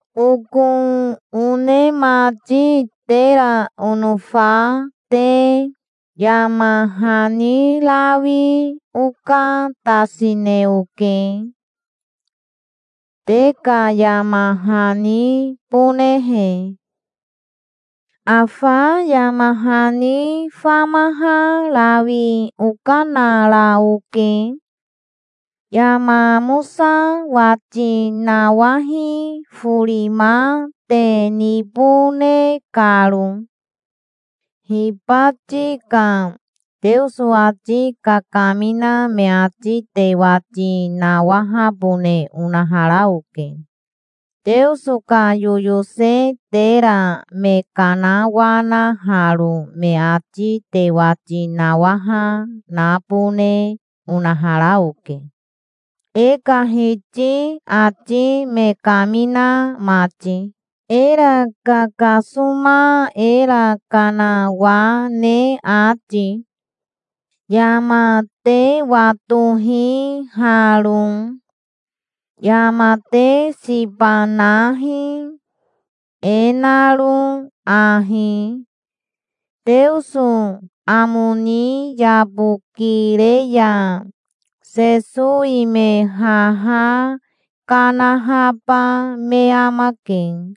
Oko one mati tera onofa te, yama hani rawi okatasine oke, te ka yama hanibonehe. Afa yama hani famaha rawi okanara oke, yama amosa wati nawahi forima te nibone karo. Hibati ka Teoso ati kakamina me ati te wati nawahabone onahara oke. Teoso ka yoyose tera me kanawanaharo me ati te wati nawaha nabone onahara oke, e ka Hiti ati me kamina mati, era kakasoma, era kanawane ati. Yama te watohi haro. Yama te siba nahi, e naro ahi: Teoso amo ni yabokire ya Sesowi me haha kanahaba me amake,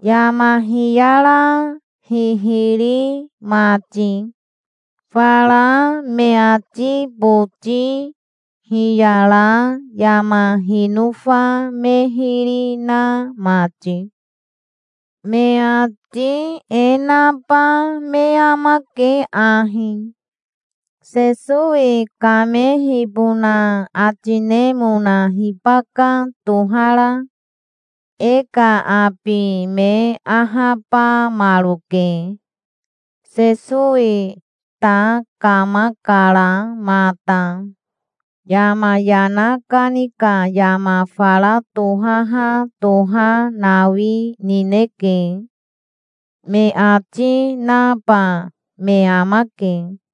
yama hiyara hihiri mati, fara me ati boti hiyara yama hinofa me hiri na mati. Me ati e naba me amake ahi: "Sesowi kamehibona ati nemona hibaka tohara? E ka abi me ahabamaroke. Sesowi ta kamakara mata. Yama yana kani ka yama fara tohaha toha nawi nineke", me ati naba me amake.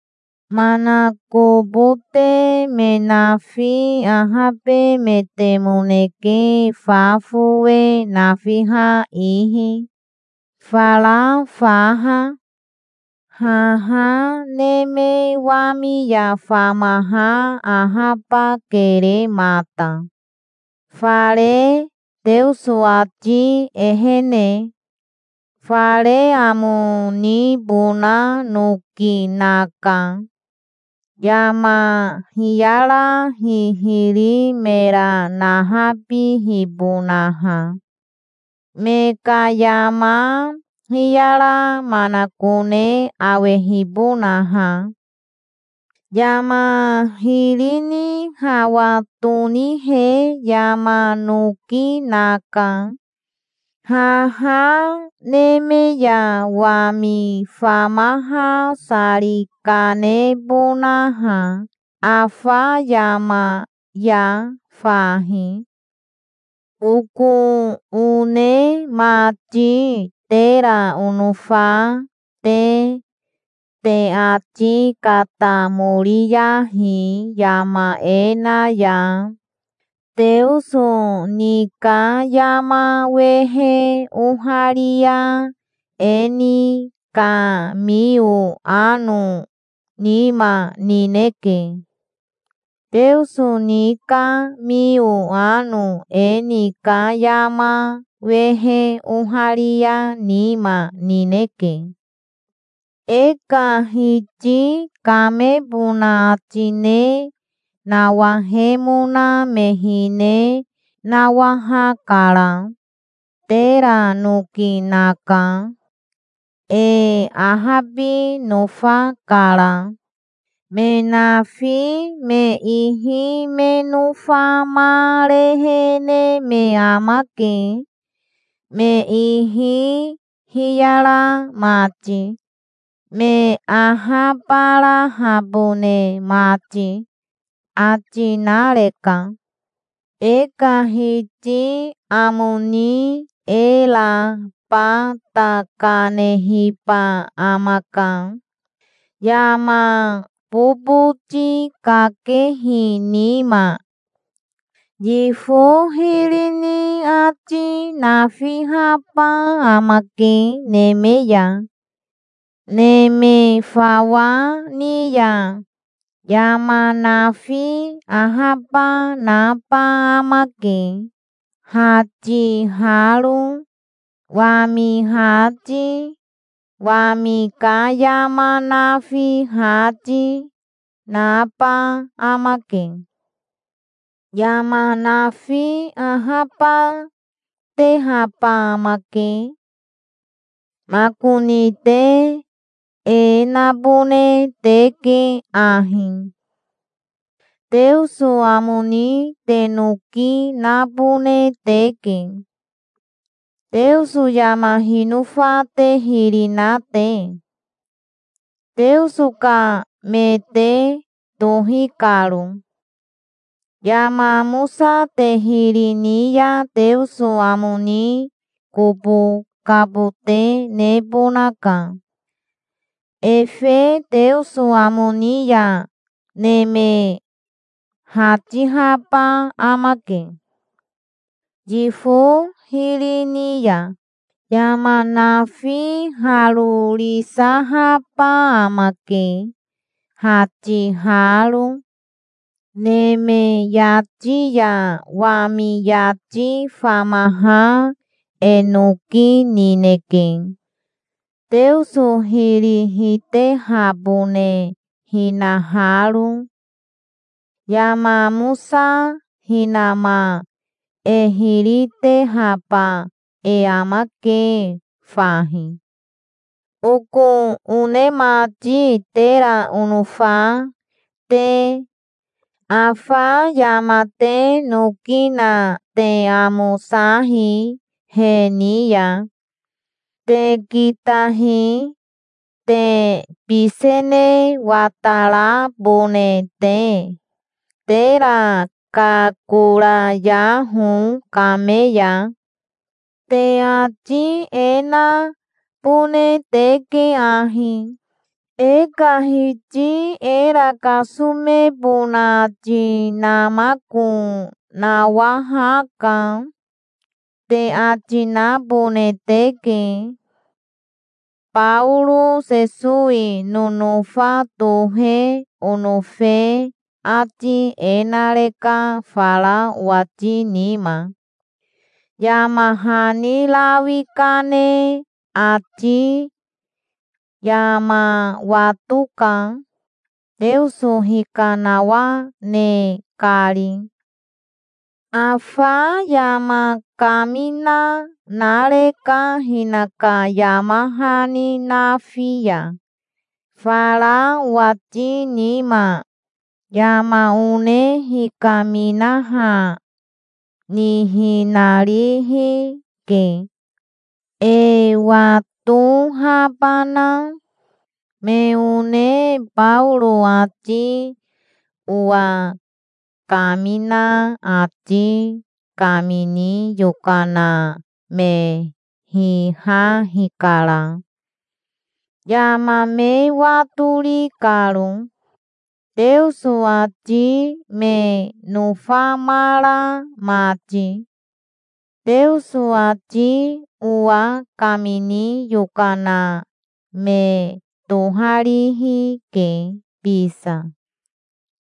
Manakobote me nafi ahabemetemoneke fa fowe nafiha ihi, fara faha. Haha neme wami ya famaha ahabakere mata, fare Teoso ati ehene. Fare amo nibona noki naka, yama hiyara hihiri mera nahabihibonaha, me ka yama hiyara manakone awehibonaha. Yama hiri ni hawa tonihe yama noki naka, haha neme ya wami famaha sari kanebonaha afa yama ya fahi. Oko one mati tera onofa te, te ati katamoriyahi yama e na ya. Teoso ni ka yama wehe oharia e ni ka mio ano nima nineke. Teoso ni ka mio ano e ni ka yama wehe oharia nima nineke. E ka Hiti kamebona ati ne nawahemona me hine nawahakara. Tera noki naka. E ahabi nofakara. Me nafi me ihi me nofamarehene me amake, me ihi hiyara mati, me ahabarahabone mati, ati nareka. E ka Hiti amo ni era bata kanehiba amaka, yama boboti kakehi nima. Yifo hiri ni ati nafihaba amake neme ya, neme fawa ni ya. Yama nafi ahaba naba amake, hatiharo. Wami hati, wami ka yama nafi hati, naba amake. Yama nafi ahabatehaba amake. Makoni te e nabone teke ahi: Teoso amo ni te noki nabone teke, Teoso yama hinofa te hiri na te, Teoso ka me te tohi karo. Yama amosa te hiri ni ya Teoso amo ni kobo kabote nebonaka. Efe Teoso amo ni ya neme hatihaba amake, yifo hiri ni ya. Yama nafi harorisahaba amake, hatiharo. Neme yati ya wami yati famaha e noki nineke, Teoso hiri hitehabone hinaharo. Yama amosa hinama e hiri tehaba e amake fahi. Oko one mati tera onofa te, afa yama te noki na te amosahi he ni ya. Te kitahi, te bisene watarabone te. Tera kakorayaho kame ya. Te ati e nabone teke ahi: "E ka Hiti era kasomebona ati namako nawahaka", te ati nabone teke. Baoro Sesowi nonofa tohe onofe ati e nareka fara owati nima, yama hani rawi kane ati. Yama watoka, Teoso hikanawane kari. Afa yama kamina nareka hinaka yama hani nafi ya, fara owati nima. Yama one hikaminaha nihinarihi ke, e watohabana. Me one Baoro ati owa kamina ati kamini yokana me hiha hikara, yama me watori karo, Teoso ati me nofamara mati. Teoso ati owa kamini yokana me toharihi ke bisa.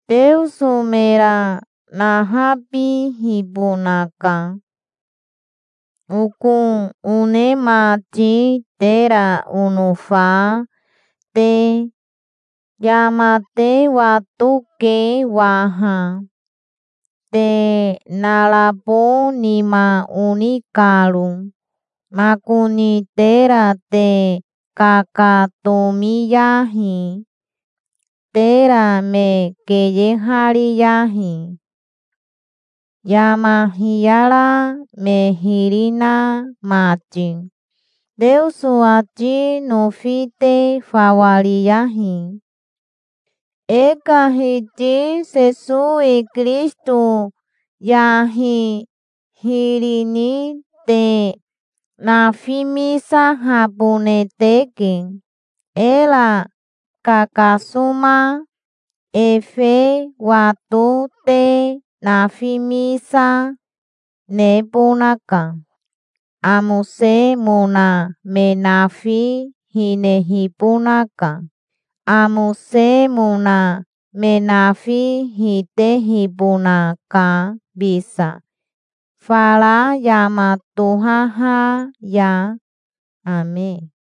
Teoso mera nahabihibonaka. Oko one mati tera onofa te, yama te watoke waha, te narabo nima oni karo. Makoni tera te kakatomiyahi. Tera me keyehariyahi, yama hiyara me hiri na mati. Teoso ati nofi te fawa riyahi. E ka Hiti Sesowi Kirisito yahi hiri ni te nafimisahabone teke, era kakasoma. Efe wato te nafimisa, nebonaka. Amosemona me nafi hinehibonaka. Amosemona me nafi hitehibonaka bisa fara yama tohaha ya. Ame.